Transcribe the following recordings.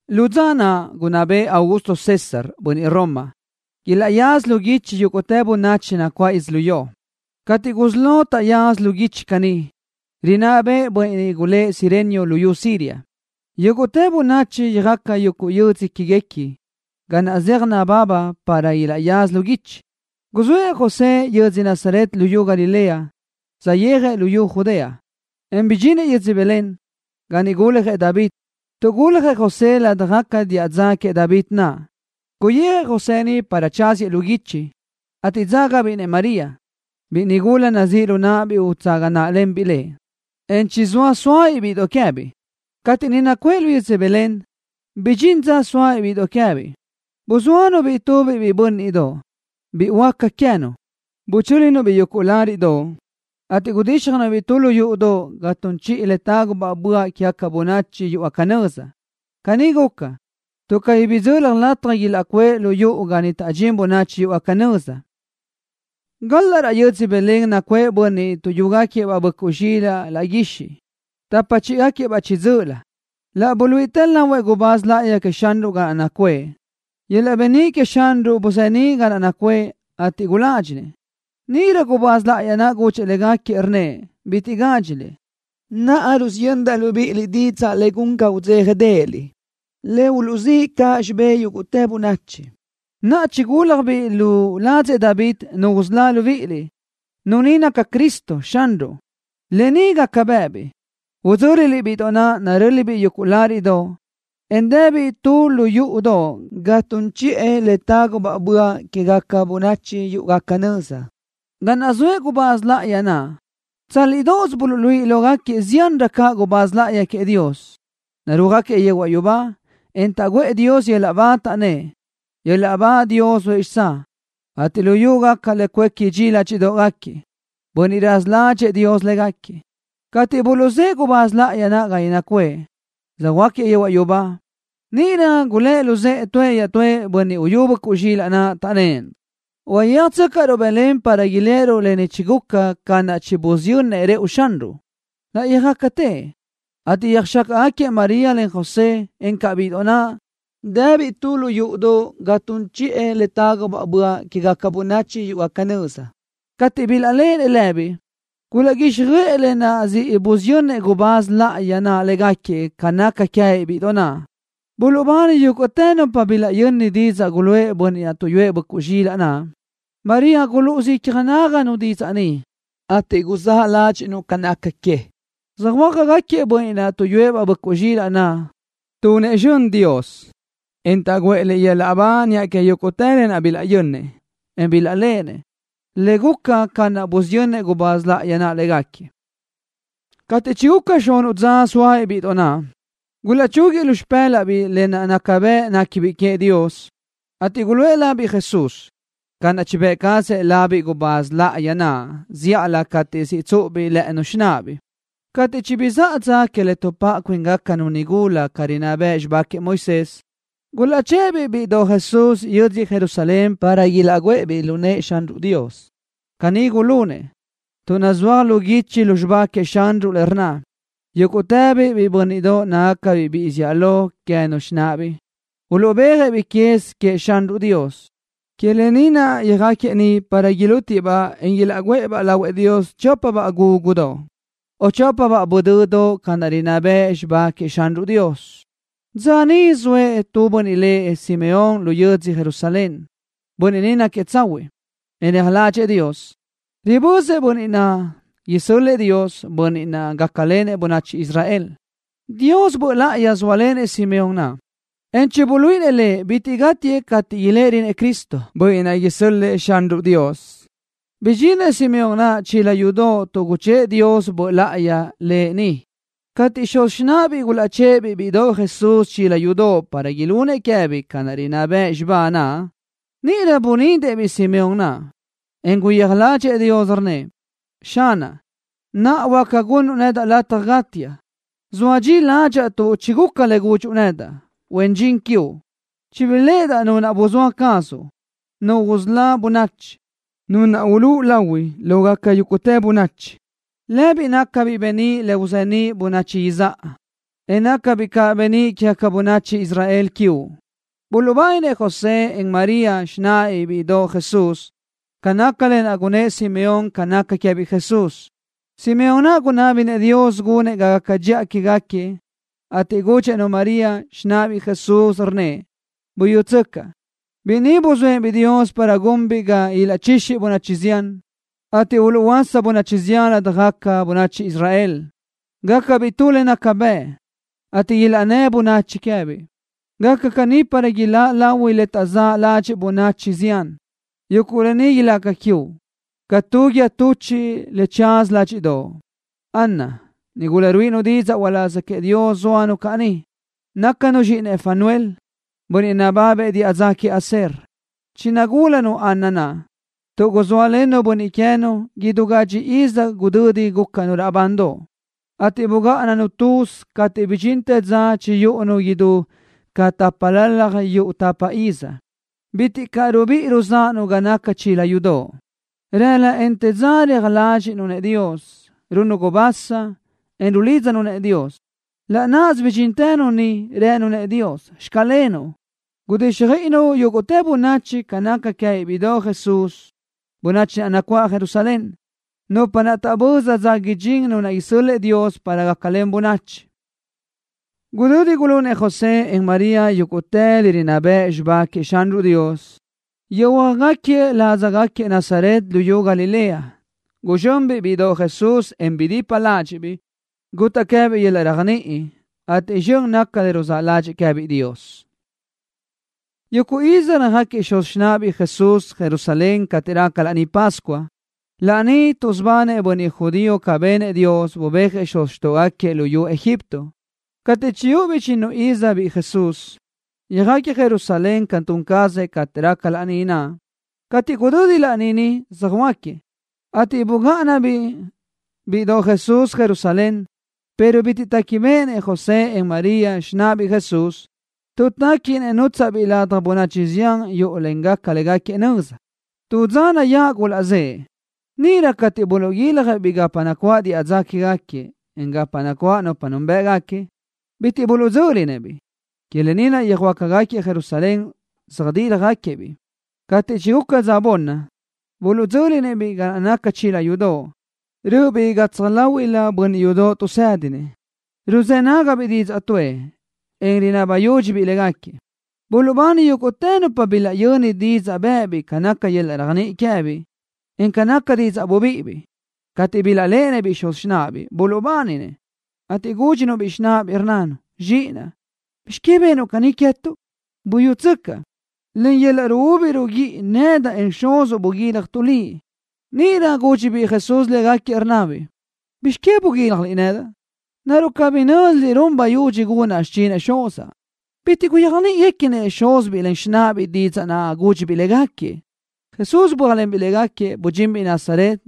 Lu dza naʼ gunná bëʼë Augusto César, bönniʼ Roma, ilaʼyaza lu guichi yúguʼtë bönachi nacuáʼ yödzölió. Cateʼ gusí lo taʼyaza lu guichi caní, rinná bëʼë bönniʼ lëʼ Cirenio luyú Siria. Yúguʼtë bönachi yöjaca yödzö que queë́guequi ga naʼ zeaj nababa para ilaʼyaza lu guichi. Guzë́ʼë José yödzö Nazaret luyú Galilea, saʼyéajëʼ luyú Judea, en bidxinëʼ yödzö Belén, ga niʼ guljëʼ David, tuʼ guljëʼ José ládajgaca diʼa dza queëʼ David naʼ. Guyijëʼ José niʼ para tsáziëʼ lu guichi, ateʼ dzágabiʼ-nëʼ María, biʼi nigula nazíʼ lu náʼabiʼ utsaga náʼalenbiʼ lëʼ, en chizóa sóabiʼ bíʼidoʼ queë́biʼ. Cateʼ niʼ nacuʼë lu yödzö Belén, bidxín dza sóabiʼ bíʼidoʼ queë́biʼ. Buzóanu-biʼ tubiʼ biʼi bö́nniʼdoʼ, biʼi huáca queë́nu. Buchö́linu-biʼ yuguʼ láriʼdoʼ, ateʼ gudíxjanu-biʼ tu lu yúʼudoʼ ga tun chiʼi le tágubaʼ böaʼ quégaca bönachi yúʼugaca nöza. Caní guca, tuʼ cabí bidzöli lataj ilaʼcuʼë lu yuʼu ga niʼ taʼdxín bönachi yúʼugaca nöza. Galaʼ raʼ yödzö Belén nacuʼë bönniʼ tuʼyúgaquiëʼ-baʼ böʼcuʼ zxilaʼ laʼ guixiʼ, tapa chíʼigaquiëʼ-baʼ chiʼi dzö́ʼölö. Laʼ buluíʼitë lahuëʼ gubáz láʼayi queëʼ Xanruʼ ga naʼ nacuʼë. Yöl-laʼ beníʼ queëʼ Xanruʼ buzeníʼ ga naʼ nacuʼë, ateʼ guládxinëʼ. Níʼirö gubáz láʼayi naʼ gudxëʼ légaquiëʼ, rnnëʼ: —Bitiʼ gádxiliʼ. Naʼa rusiyöndaʼ libíʼiliʼ didzaʼ le gun ga udzéjadeʼeliʼ, le uluʼzíʼ caʼ xibé yúguʼtë bönachi. Naʼa chigúlajbiʼ lu ladzëʼ David Nu usölá libíʼiliʼ. Nu ni naca Cristo, Xanruʼ. Lë ni gaca bë́ʼëbiʼ. Udzö́liliʼ-biʼ Bíʼidoʼ naʼ, narö́libiʼ yuguʼ láriʼdoʼ, en dëbiʼ tu lu yúʼudoʼ ga tun chiʼi le tágubaʼ böaʼ quégaca bönachi yúʼugaca nöza. Ga naʼ zoëʼ gubáz láʼayi naʼ, tsálidoʼos buluʼluíʼi lógaquiëʼ ziánrö caʼ gubáz láʼayi queëʼ Dios, narúajgaquiëʼ yehuaʼ yubá, en taʼguʼë Dios yöl-laʼ ba, taʼnnë́ʼ: ¡Yöl-laʼ ba Dios zoëʼ xitsáʼ, ateʼ luyú gaca le cuéqui dxi ládxiʼdoʼgaquiëʼ bönniʼ raza ládxëʼë Dios légaquiëʼ! Cateʼ buluʼzë́ʼë gubáz láʼayi naʼ ga niʼ nacuʼë, söjhuö́jgaquiëʼ yehuaʼ yubá, níʼirö gulë́ luzë́ʼë tuëʼ iaʼtúëʼ bönniʼ uyú böʼcuʼ zxilaʼ naʼ, taʼnnë́ʼ: —Uyéajtsöcaʼruʼ Belén para iléʼeruʼ lë ni chiguca ca naʼ chibusiyönnëʼ Xanruʼ rëʼu. Laʼ yöjácatiëʼ, ateʼ yöjxácaʼgaquiëʼ María len José, encaʼ bíʼidoʼ naʼ, dëbiʼ tu lu yúʼudoʼ ga tun chiʼi le tágubaʼ böaʼ quégaca bönachi yúʼugaca nöza. Cateʼ bilaʼléʼenëʼ lëbiʼ, gulaʼguíxjöʼë lë naʼ siʼ busiyönnëʼ gubáz láʼayi naʼ légaquiëʼ ca naca queë́biʼ bíʼidoʼ naʼ. Buluʼbani yúguʼtë nupa bilaʼyöni didzaʼ guluʼë bönniʼ tuʼyúëʼ böʼcuʼ zxilaʼ naʼ. María gulúʼusö icja náganu didzaʼ ni, ateʼ guzáʼ ládxiʼnu ca naca que. Söjhuö́jgaquiëʼ bönniʼ naʼ tuʼyúëʼ-baʼ böʼcuʼ zxilaʼ, tunëʼ zxön Dios, en taʼguʼë Lëʼ yöl-laʼ ba niʼa que yúguʼtë lë naʼ bilaʼyönnëʼ, en bilaʼléʼenëʼ, le guca ca naʼ busiyönnëʼ gubáz láʼayi naʼ légaquiëʼ. Cateʼ chiguca xunuʼ dza zóabiʼ bíʼidoʼ naʼ, gulaʼchúguiëʼ lu xipë́laʼbiʼ lë naʼ naca bëʼ néquibiʼ queëʼ Dios, ateʼ guluʼë labiʼ Jesús ca naʼ chibë́ʼ cazëʼ labiʼ gubáz láʼayi naʼ zíʼalö cateʼ siʼ tsúʼubiʼ lë́ʼënu xináʼabiʼ. Cateʼ chibizáʼa dza que le tuʼpáʼa cuíngacanu nigula ca rinná bëʼ xibá queëʼ Moisés, gulaʼchë́ʼë-biʼ bíʼidoʼ Jesús yödzö Jerusalén para ilaʼguʼë-biʼ lu nëʼë Xanruʼ Dios. Caní gulunëʼ, tuʼ nazúaj lu guichi lu xibá queëʼ Xanruʼ le rnna: “Yúguʼtëbiʼ biʼi bö́nniʼdoʼ nácagacabiʼ biʼi zíʼalö queë́nu xináʼagacabiʼ, uluʼbéajëʼ-biʼ quez queëʼ Xanruʼ Dios.” Que lë ni naʼ yöjáquiëʼ niʼ para ilútiëʼ-baʼ, en ilaʼgúʼë-baʼ lahuëʼ Dios chópabaʼ gúgudoʼ o chópabaʼ budöduʼ ca naʼ rinná bëʼ xibá queëʼ Xanruʼ Dios. Dza níʼisö zoëʼ tu bönniʼ lëʼ Simeón lu yödzö Jerusalén. Bönniʼ ni náquiëʼ tsahuiʼ, en reaj ládxëʼë Dios. Ribözëʼ Bönniʼ naʼ isö́l-lëʼë Dios, Bönniʼ naʼ gácalenëʼ bönachi Israel. Dios Böʼ Láʼayi zóalenëʼ Simeón naʼ, en chibuluíʼinëʼ lëʼ bitiʼ gátiëʼ cateʼ iléʼerönëʼ Cristo, Bönniʼ naʼ isö́l-lëʼë Xanruʼ Dios. Bidxinëʼ Simeón naʼ chila yudoʼ tuʼ guchë́ʼë Dios Böʼ Láʼayi lëʼ niʼ. Cateʼ xuz xináʼabiʼ gulaʼchë́ʼë-biʼ bíʼidoʼ Jesús chila yudoʼ para ilunëʼ queë́biʼ ca rinná bëʼ xibá naʼ, níʼirö bunidëʼ-biʼ Simeón naʼ, en guyéaj ládxëʼë Dios, rnnëʼ: Xanaʼ, naʼa huáca gunnuʼ nedaʼ lataj gátiaʼ, soa dxi ládxaʼa tuʼ chiguca le gudxuʼ nedaʼ, huen dxin quiuʼ. Chibiléʼedaʼ Nu naʼ buzóa cazuʼ, Nu usölá bönachi, Nu naʼ ulúʼu lahui lógaca yúguʼtë bönachi. Lëbiʼ nácabiʼ beníʼ le uzeníʼ bönachi izáʼa, en nácabiʼ caʼ beníʼ quégaca bönachi Israel quiuʼ. Buluʼbáninëʼ José, en María, xináʼabiʼ bíʼidoʼ Jesús, ca naca lë naʼ gunnë́ʼ Simeón ca naca queë́biʼ Jesús. Simeón naʼ gunábinëʼ Dios gunëʼ ga gaca dxiʼa quégaquiëʼ, ateʼ gudxëʼ-nu María, xináʼabiʼ Jesús, rnnëʼ: —Buyútsöcaʼ. Biʼi ni nuzóëʼ-biʼ Dios para gunbiʼ ga ilaʼchixi bönachi zián, ateʼ uluʼhuöása bönachi zián ladaj bönachi Israel. Gácabiʼ tu le naca bëʼ, ateʼ ilaʼnnë́ bönachi queë́biʼ. Gaca caní para ilaʼláʼ lahui le taʼzáʼ ládxiʼgaca bönachi zián. Yuguʼ lë ni ilaca quiuʼ ca tu guíë tuchiʼ le tsaza ládxiʼdoʼo. Ana, nigula ruíʼinu didzaʼ uláz queëʼ Dios, zóanu caʼ niʼ. Nácanu zxíʼinëʼ Fanuel, bönniʼ nababëʼ diʼa dza queëʼ Aser. Chinagúladaʼanu Ana naʼ, tuʼ guzóalennu bönniʼ queë́nu idú gadxi iz gudödi gúcanu raʼbandoʼ, ateʼ bugáʼananu tuzi cateʼ bidxintë dza chiyúʼunu idú ca tápalalaj yuʼ tapa iz. Bitiʼ caʼ rubíʼi ruzáʼanu ga naca chila yudoʼ. Rëla, en te dza reaj ládxiʼnu-nëʼ Dios, runnu gubasa, en rulídzanu-nëʼ Dios. Laʼ náʼasö bidxíntënu niʼ, rënu-nëʼ Dios: “Xclenuʼ.” Gudíxjöiʼinu yúguʼtë bönachi ca naca queë́biʼ bíʼidoʼ Jesús, bönachi naʼ nacuáʼ Jerusalén, nupa taʼböza dza idxín Nu naʼ isö́l-lëʼë Dios para gácalen bönachi. Gudödi gulunëʼ José, en María yúguʼtë le rinná bëʼ xibá queëʼ Xanruʼ Dios, yöjhuö́jgaquiëʼ ládzagaquiëʼ Nazaret luyú Galilea. Guzxönbiʼ bíʼidoʼ Jesús, en bidipa ládxiʼbiʼ. Gutaʼ queë́biʼ yöl-laʼ réajniʼi, ateʼ zxön naca le ruzáʼ ládxëʼë queë́biʼ Dios. Yuguʼ iz röjáquiëʼ xuz xináʼabiʼ Jesús Jerusalén cateʼ raca Laní Pascua, laní tuʼsubanëʼ bönniʼ judío ca benëʼ Dios, bubéajëʼ xuz xtóʼogaquiëʼ luyú Egipto. Cateʼ chiyúʼubiʼ chinnu iz biʼi Jesús, yöjáquiëʼ Jerusalén ca tun cazëʼ cateʼ raca laní naʼ. Cateʼ gudödi laní, söjhuö́jgaquiëʼ, ateʼ bugáʼanabiʼ bíʼidoʼ Jesús Jerusalén, pero bitiʼ téquibeʼenëʼ José, en María, xináʼabiʼ Jesús. Tuʼ téquinëʼ nútsaʼbiʼ ladaj bönachi zián yúʼulengaca légaquiëʼ nöza, tu dza nayáʼ gulaʼzë́ʼë. Níʼirö cateʼ buluʼguiljëʼ-biʼ gapa nacuáʼ diʼa dza quégaquiëʼ, en gapa nacuáʼ nupa núnbëʼgaquiëʼ bitiʼ buluʼdzö́linëʼ-biʼ. Que lë ni naʼ yöjhuö́jgaquiëʼ Jerusalén, söjdíljagaquiëʼ-biʼ. Cateʼ chiguca dza bunni, buluʼdzö́linëʼ-biʼ ga naca chila yudoʼ, rö́ʼöbiʼ gatsaj láhuiʼlëʼ bönniʼ yudoʼ tuʼsédinëʼ. Ruzë́ nágabiʼ didzaʼ tuʼë, en rinaba yúdxibiʼ légaquiëʼ. Buluʼbani yúguʼtë nupa bilaʼyöni didzaʼ bë́ʼëbiʼ ca naca yöl-laʼ réajniʼi queë́biʼ, en ca nácagaca didzaʼ bubíʼibiʼ. Cateʼ bilaʼléʼenëʼ-biʼ xuz xináʼabiʼ, buluʼbáninëʼ, ateʼ gúdxinu-biʼ xináʼabiʼ, rnnanu: —Zxiʼinaʼ, ¿bizx que benuʼ caní queë́tuʼ? Buyútsöcaʼ, len yöl-laʼ ruúbi ruguíʼi nedaʼ, en xuzuʼ buguíljatuʼ liʼ. Níʼirö gúdxibiʼ Jesús légaquiëʼ, rnnabiʼ: —¿Bizx que buguíljaliʼ nedaʼ? ¿Naruʼ cabí nö́ziliʼ run bayudxi gunaʼ xichinëʼ Xuzaʼ? Bitiʼ gulaʼyéajniʼinëʼ xuz xináʼabiʼ didzaʼ naʼ gúdxibiʼ légaquiëʼ. Jesús bö́ajlenbiʼ légaquiëʼ, budxinbiʼ Nazaret,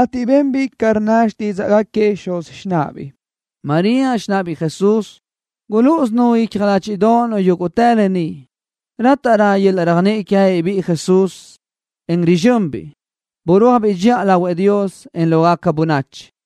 ateʼ benbiʼ ca rnna xtídzaʼgaquiëʼ xuz xináʼabiʼ. María, xináʼabiʼ Jesús, gulúʼusönu icja ládxiʼdoʼonu yúguʼtë lë ni. Rátaʼrö yöl-laʼ réajniʼi queë́biʼ biʼi Jesús, en rizxönbiʼ. Burúajbiʼ dxiʼa lahuëʼ Dios, en lógaca bönachi.